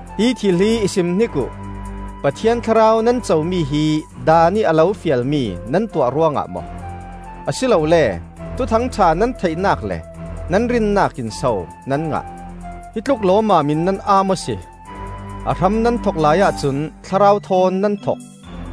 Hi thil hi i simhnik uh: Pathian Thlarau nan comi hi Daan ih a lo fialmi nan tuah ruangah maw, a si lole Thuthang ṭha nan theihnak le nan rinnak in so nan ngah? Hi tluk lawmmam in nan aa maw si! A hram nan thok laiah cun Thlarau thawn nan thok;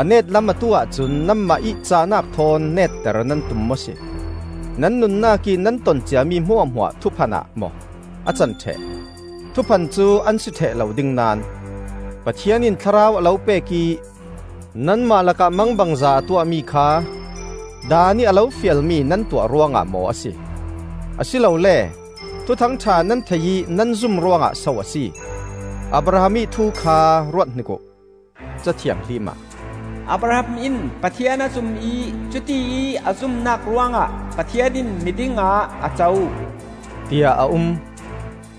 a net lam atu ahcun nanmah ih cahnak thawn netter nan tum maw si? Nan nunnak ih nan ton ciami hmuahhmuah thuphan ah maw a can ṭheh? Thuphan cu an si ṭheh lo ding naón! Pathian in Thlarau a lo pek ih nanmah lakah mangbangza a tuahmi kha Daan ih a lo fialmi nan tuah ruangah maw a si? a si lole Thuthang ṭha nan thei ih nan zum ruangah so a si? Abraham ih thu kha ruathnik uh. Ca Thianghlim ah, “Abraham in Pathian a zum ih cutiih a zumnak ruangah Pathian in miding ah a co,” tiah a um.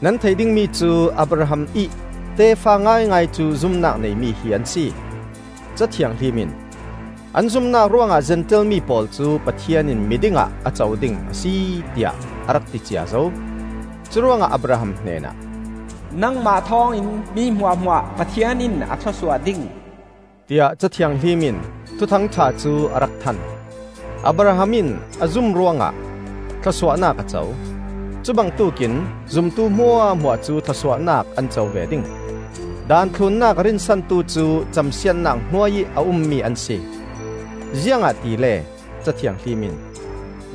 Nan theih dingmi cu, Abraham ih tefa ngaingai cu zumnak neimi hi an si. Ca Thianghlim in, “An zumnak ruangah Zentail mi pawl cu Pathian in miding ah a co ding a si,” tiah a rak ti cia zo. Curuangah Abraham hnenah, “Nangmah thawngin mi hmuahhmuah Pathian in a thlawsuah ding,” tiah Ca Thianghlim in Thuthang ṭha cu a rak than. Abraham in a zum ruangah thlawsuahnak a co. Cubangtuk in zumtu hmuahhmuah cu thlawsuahnak an co ve ding. Daan thlunnak a rinsantu cu camsiatnak hnuai ih a ummi an si. Ziangahtile Ca Thianghlim in,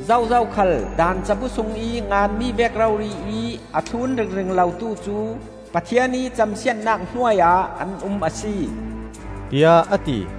“Zozo khal Daan cabu sungih nganmi vek rori ih a thlun ringring lotu cu Pathian ih camsiatnak hnuai ah an um a si,” tiah a ti.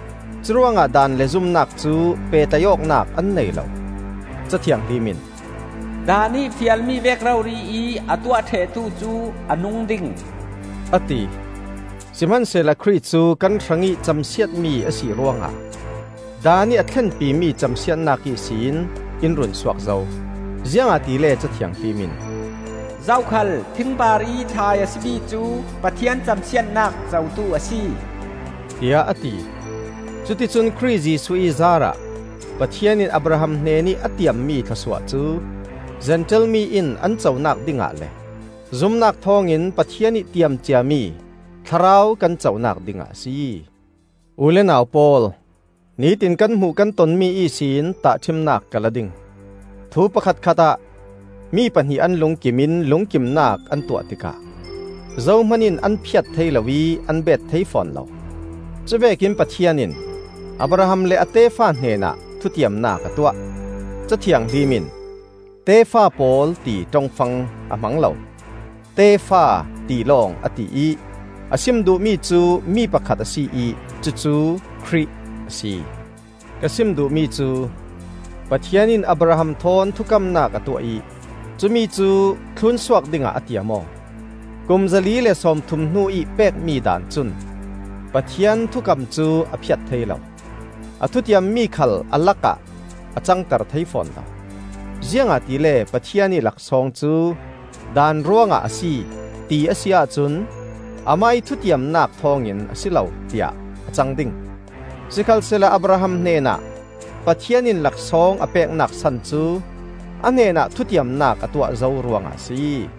Curuangah Daan le zumnak cu pehtlaih awknak an nei lo. Ca Thianghlim in, “Daan ih fialmi vek rori ih a tuah ṭhehtu cu a nung ding,” a ti. Sihmansehla Khrih cu kan hrangih camsiatmi a si ruangah Daan ih a thlenpimi camsiatnak ihsin in runsuak zo. Ziangahtile Ca Thianghlim in, “Zokhal thing parih thlai a si mi cu Pathian camsiatnak cotu a si,” tiah a ti. Cuticun Khrih Jesuh ih zaarah Pathian in Abraham hnenih a tiammi thlawsuah cu Zentail mi in an conak dingah le zumnak thawngin Pathian ih tiam ciami Thlarau kan conak dingah a si. U le nau pawl, nitin kan hmuh kan tonmi ihsin tahṭhimnak ka la ding: thu pakhatkhatah mi pahnih an lungkim in lungkimnak an tuah tikah zohman in an phiat thei lo ih an beet thei fawn lo. Cuvekin Pathian in Abraham le a tefa hnenah thutiamnak a tuah. Ca Thianghlim in, “Tefa pawl,” ti ṭongfang a hmang lo, “Tefa,” ti lawng a ti ih a sim duhmi cu mi pakhat a si ih cucu Khrih a si. Ka sim duhmi cu, Pathian in Abraham thawn thukamnak a tuah ih cumi cu thlunsuak dingah a tiam aw. Kum zali le sawmthum hnu-ih pekmi Daan cun Pathian thukam cu a phiat thei lo. A thutiammi khal a lakah a cangter thei fawn lo. Ziangahtile Pathian ih laksawng cu Daan ruangah a si, ti a si ahcun Amah ih thutiamnak thawngin a si lo, tiah a cang ding. Sikhalsehla Abraham hnenah Pathian in laksawng a peknak san cu a hnenah thutiamnak a tuah zo ruangah a si.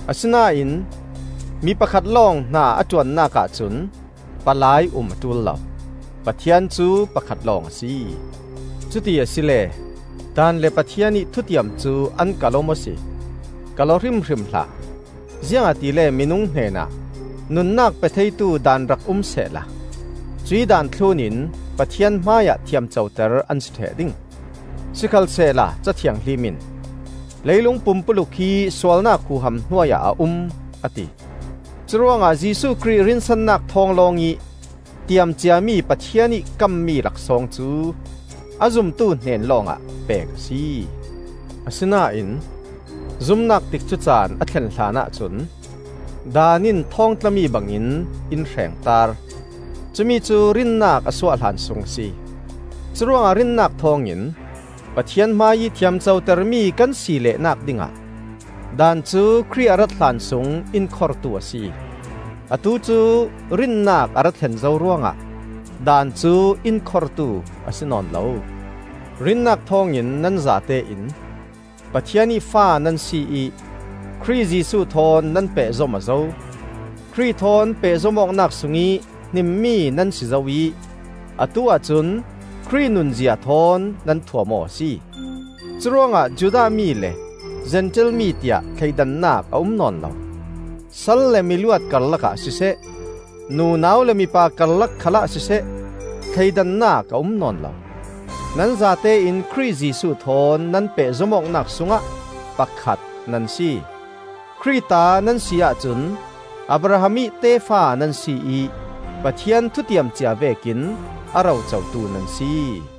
Asinain mi pakhat lawng hna a ṭuannak ahcun palai um a ṭul lo; Pathian cu pakhat lawng a si. Cuti asile Daan le Pathian ih thutiam cu an kalh-aw maw si? Kalh-aw hrimhrim hlah! Ziangahtile minung hnenah nunnak pe theitu daan rak um sehla, cuih daan thlunin Pathian hmaiah thiamcoter an si ṭheh ding. Sikhalsehla Ca Thianghlim in, “Leilung pumpuluk hi sualnak huham hnuai ah a um,” a ti. Curuangah Jesuh Khrih rinsannak thawng lawngih tiam ciami Pathian ih kammi laksawng cu a zumtu hnen lawngah pek a si. Asinain zumnak tikcu caan a thlen hlanah cun Daan in thawngtlami bangin in hrengtaar; cumicu rinnak a suah hlan sung a si. Curuangah rinnak thawngin Pathian hmaiih thiamcotermi kan si leh-nak dingah, Daan cu Khrih a rat hlan sung in khortu a si. Atu cu rinnak a ra thlen zo ruangah Daan cu in khortu a si nawn lo. Rinnak thawngin nan zatein Pathian ih fa nan si ih Khrih Jesuh thawn nan pehzom aw zo. Khrih thawn pehzom awknak sungih hnimmi nan si zo ih atu ahcun Khrih nunzia thawn nan thuam aw a si. Curuangah Judah mi le Zentail mi tiah thleidannak a um nawn lo; sal le miluat karlakah siseh, nunau le mipa karlak khalah siseh, thleidannak a um nawn lo. Nan zatein Khrih Jesuh thawn nan pehzom awknak sungah pakhat nan si. Khrih ta nan si ahcun Abraham ih tefa nan si ih Pathian thutiam cia vekin a ro cotu nan si.